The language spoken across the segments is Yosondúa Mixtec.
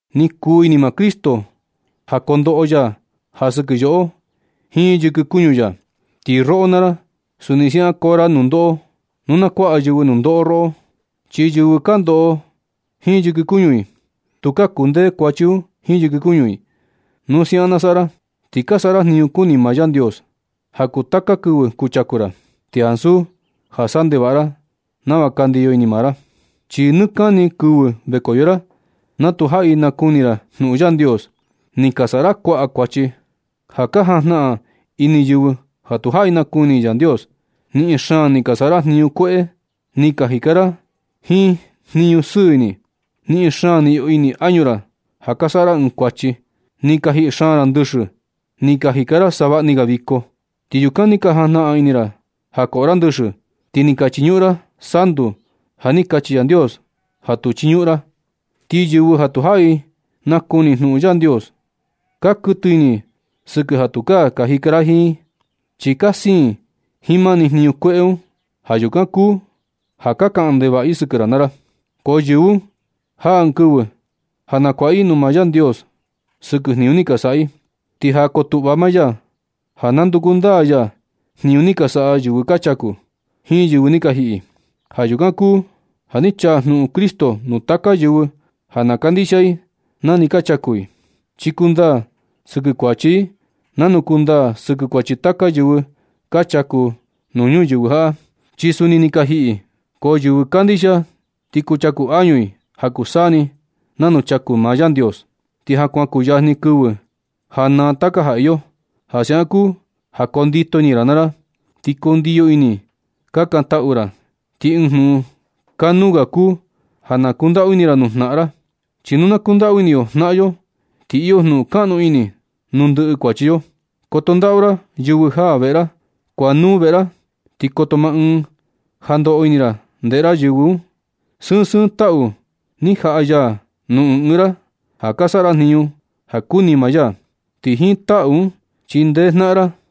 Ni kuu ini maa Cristo ja kondoꞌo ya ja sɨkɨ yoꞌo jiin yɨkɨ kuñu ya. Ti roꞌo naa ra, suni siaꞌan koo ra nundoꞌo nu na kuaꞌa yɨvɨ nundoꞌo roꞌo. Chi yɨvɨ ka ndoꞌo jiin yɨkɨ kuñu i, tukaa kundee kuachi un jiin yɨkɨ kuñu i. Nu siaꞌan na saꞌa ra, ti ka saꞌa ra jniñu kuni maa Yandios ja kuu taka kɨvɨ kuchaku ra, ti ansu ja saꞌa ndevaꞌa ra nava ka ndiyo ini maa ra. Chi nɨ kani kɨvɨ vekoyo ra, na tu jaꞌi nakuni ra jnuꞌun Yandios, ni ka saꞌa ra kuaꞌa kuachi ja ka jajnaꞌan ini yɨvɨ ja tu jaꞌi nakuni i Yandios. Niꞌin xaan ni ka saꞌa ra jniñu kueꞌe. Ni ka jika ra jiin jnuꞌun sɨɨ ini. Niꞌin xaan ni iyo ini añu ra ja saꞌa ra ɨɨn kuachi. Ni ka jiꞌi xaan ra ndɨxɨ. Ni ka jika ra savaꞌni ga viko. Ti yukan ni ka jajnaꞌan ini ra ja koꞌo ra ndɨxɨ. Ti ni ka chiñuꞌun ra santu ja ni kachi Yandios ja tu chiñuꞌun ra. Ti yɨvɨ ja tu jaꞌi nakuni jnuꞌun Yandios, ka kuɨtɨ ini i sɨkɨ ja tukaa ka jika ra jiin i, chi ka siin i jiin mani jniñu kueꞌe un. Ja yukan kuu ja ka kaꞌan ndevaꞌa i sɨkɨ ra naa ra. Ko yɨvɨ un jaa ɨɨn kɨvɨ ja nakuaꞌa i nuu maa Yandios sɨkɨ jniñu ni ka saꞌa i. Ti ja ko tuꞌva maa ya ja nanduku ndaa ya jniñu ni ka saꞌa yɨvɨ ka chaku, jiin yɨvɨ ni ka jiꞌi. Ja yukan kuu ja ni chaa jnuꞌun Cristo nuu taka yɨvɨ ja na kandixia i na ni ka chaku i. Ti kuu ndaa sɨkɨ kuachi i nanu kundaa sɨkɨ kuachi taka yɨvɨ ka chaku nuu ñuyɨvɨ jaꞌa, chi suni ni ka jiꞌi i. Ko yɨvɨ kandixia ti kuchaku añu i ja kuu saa ni nanu chaku maa Yandios. Ti ja kuan kuyajni kɨvɨ ja naa taka ja iyo. Ja siaꞌan kuu ja kondito ini naa ra. Ti kundiyo ini kakantaꞌu ra. Ti ɨɨn jnuꞌun kanuu ga kuu ja na kundaꞌu ini ra nuu jnaꞌan ra. Chi nu na kundaꞌu ini yo jnaꞌan yo, ti iyo jnuꞌun kaꞌnu ini nuu ndɨꞌɨ kuachi yo. Koto ndaꞌu ra yɨvɨ jaa veꞌe ra. Kuaꞌa nuu veꞌe ra, ti koto ma ɨɨn ja ndoꞌo ini ra ndeꞌe ra yɨvɨ un. Sɨɨn sɨɨn taꞌu ni jaꞌa ya nuu ɨɨn ɨɨn ra ja ka saꞌa ra jniñu ja kuni maa ya. Ti jiin taꞌu un chindee ra jnaꞌan ra.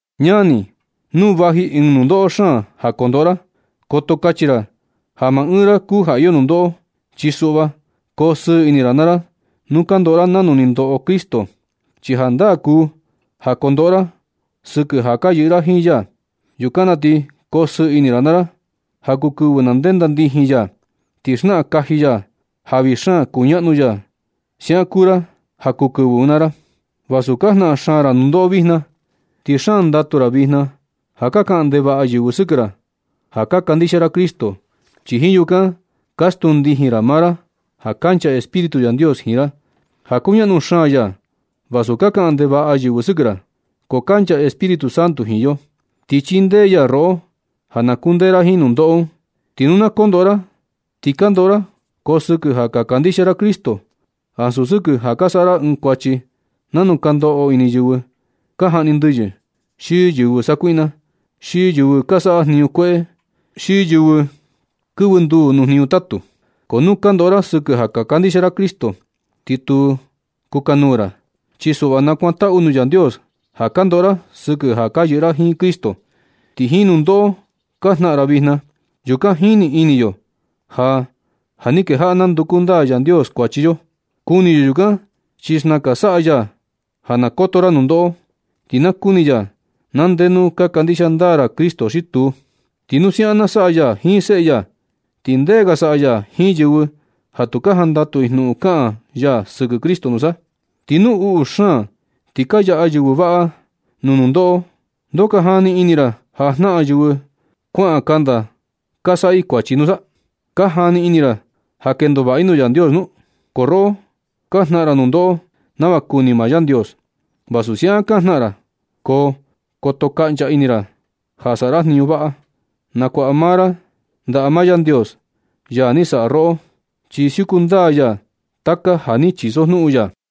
Ñani, nu vaji ɨɨn nundoꞌo xaan ja kondoꞌo ra, koto kachi ra ja maa ɨɨn ra kuu ja iyo nundoꞌo. Chi suꞌva, ko sɨɨ ini naa ra nu ka ndoꞌo ra nanu ni ndoꞌo Cristo, chi jandaa kuu ja kondoꞌo ra sɨkɨ ja ka yɨꞌɨ ra jiin ya. Yukan na ti koo sɨɨ ini ra naa ra ja kuu kɨvɨ na ndenda ndijin ya, ti xnaꞌan kaji ya ja vii xaan kuñaꞌnu ya. Siaꞌan kuu ra ja kuu kɨvɨ un naa ra vasu ka jnaꞌan xaan ra nundoꞌo vijna. Ti xaan ndatu ra vijna ja ka kaꞌan ndevaꞌa yɨvɨ sɨkɨ ra ja ka kandixia ra Cristo. Chi jiin yukan ka stuu ndijin ra maa ra ja kancha Espíritu Yandios jiin ra, ja kuñaꞌnu xaan ya. Vasu ka kaꞌan ndevaꞌa yɨvɨ sɨkɨ ra, ko kancha Espíritu Santo jiin yo, ti chindee ya roꞌo ja na kundee ra jiin nundoꞌo un. Ti nu ka ndoꞌo ra, ti ka ndoꞌo ra, ko sɨkɨ ja ka kandixia ra Cristo, ansu sɨkɨ ja ka saꞌa ra ɨɨn kuachi nanu ka ndoꞌo yɨvɨ ka jaꞌni ndɨyɨ, xi yɨvɨ sakuiꞌna, xi yɨvɨ ka saꞌa jniñu kueꞌe, xi yɨvɨ kɨvɨ nduu nuu jniñu tatu. Ko nu ka ndoꞌo ra sɨkɨ ja ka kandixia Cristo, ti tu kukanuu ra. Chi suꞌva, nakuantaꞌu nuu Yandios ja ka ndoꞌo ra sɨkɨ ja ka yɨꞌɨ ra jiin Cristo. Ti jiin nundoꞌo ka jnaꞌan ra vijna, yukan jini ini yo ja ja ni kejaꞌa nanduku ndaa Yandios kuachi yo. Kuni yo yukan, chi xnakan saꞌa ya ja na koto ra nundoꞌo. Ti na kuni ya na ndenu ka kandixia ndaa ra Cristo xi tuu. Ti nu siaꞌan na saꞌa ya jiin seꞌe ya, ¿ti ndee ga saꞌa ya jiin yɨvɨ ja tu ka jandatu i jnuꞌun kaꞌan ya sɨkɨ Cristo nusa? Ti nu uꞌu xaan ti ka yaꞌa yɨvɨ vaꞌa nuu nundoꞌo, ¿Ndoo ka jani ini ra ja jnaꞌan yɨvɨ kuaꞌan kanda ja ka saꞌa i kuachi nusa? ¿Ka jani ini ra ja ka kendo vaꞌa i nuu Yandios nu? Ko roꞌo ja ka jnaꞌan ra nundoꞌo nava kuni maa Yandios, vasu siaꞌan ka jnaꞌan ra, ko koto kaꞌncha ini ra ja saꞌa ra jniñu vaꞌa. Nakuaꞌa maa ra ndaꞌa maa Yandios, ya ni saꞌa roꞌo, chi siuku ndaa ya taka ja ni chisojnuꞌun ya.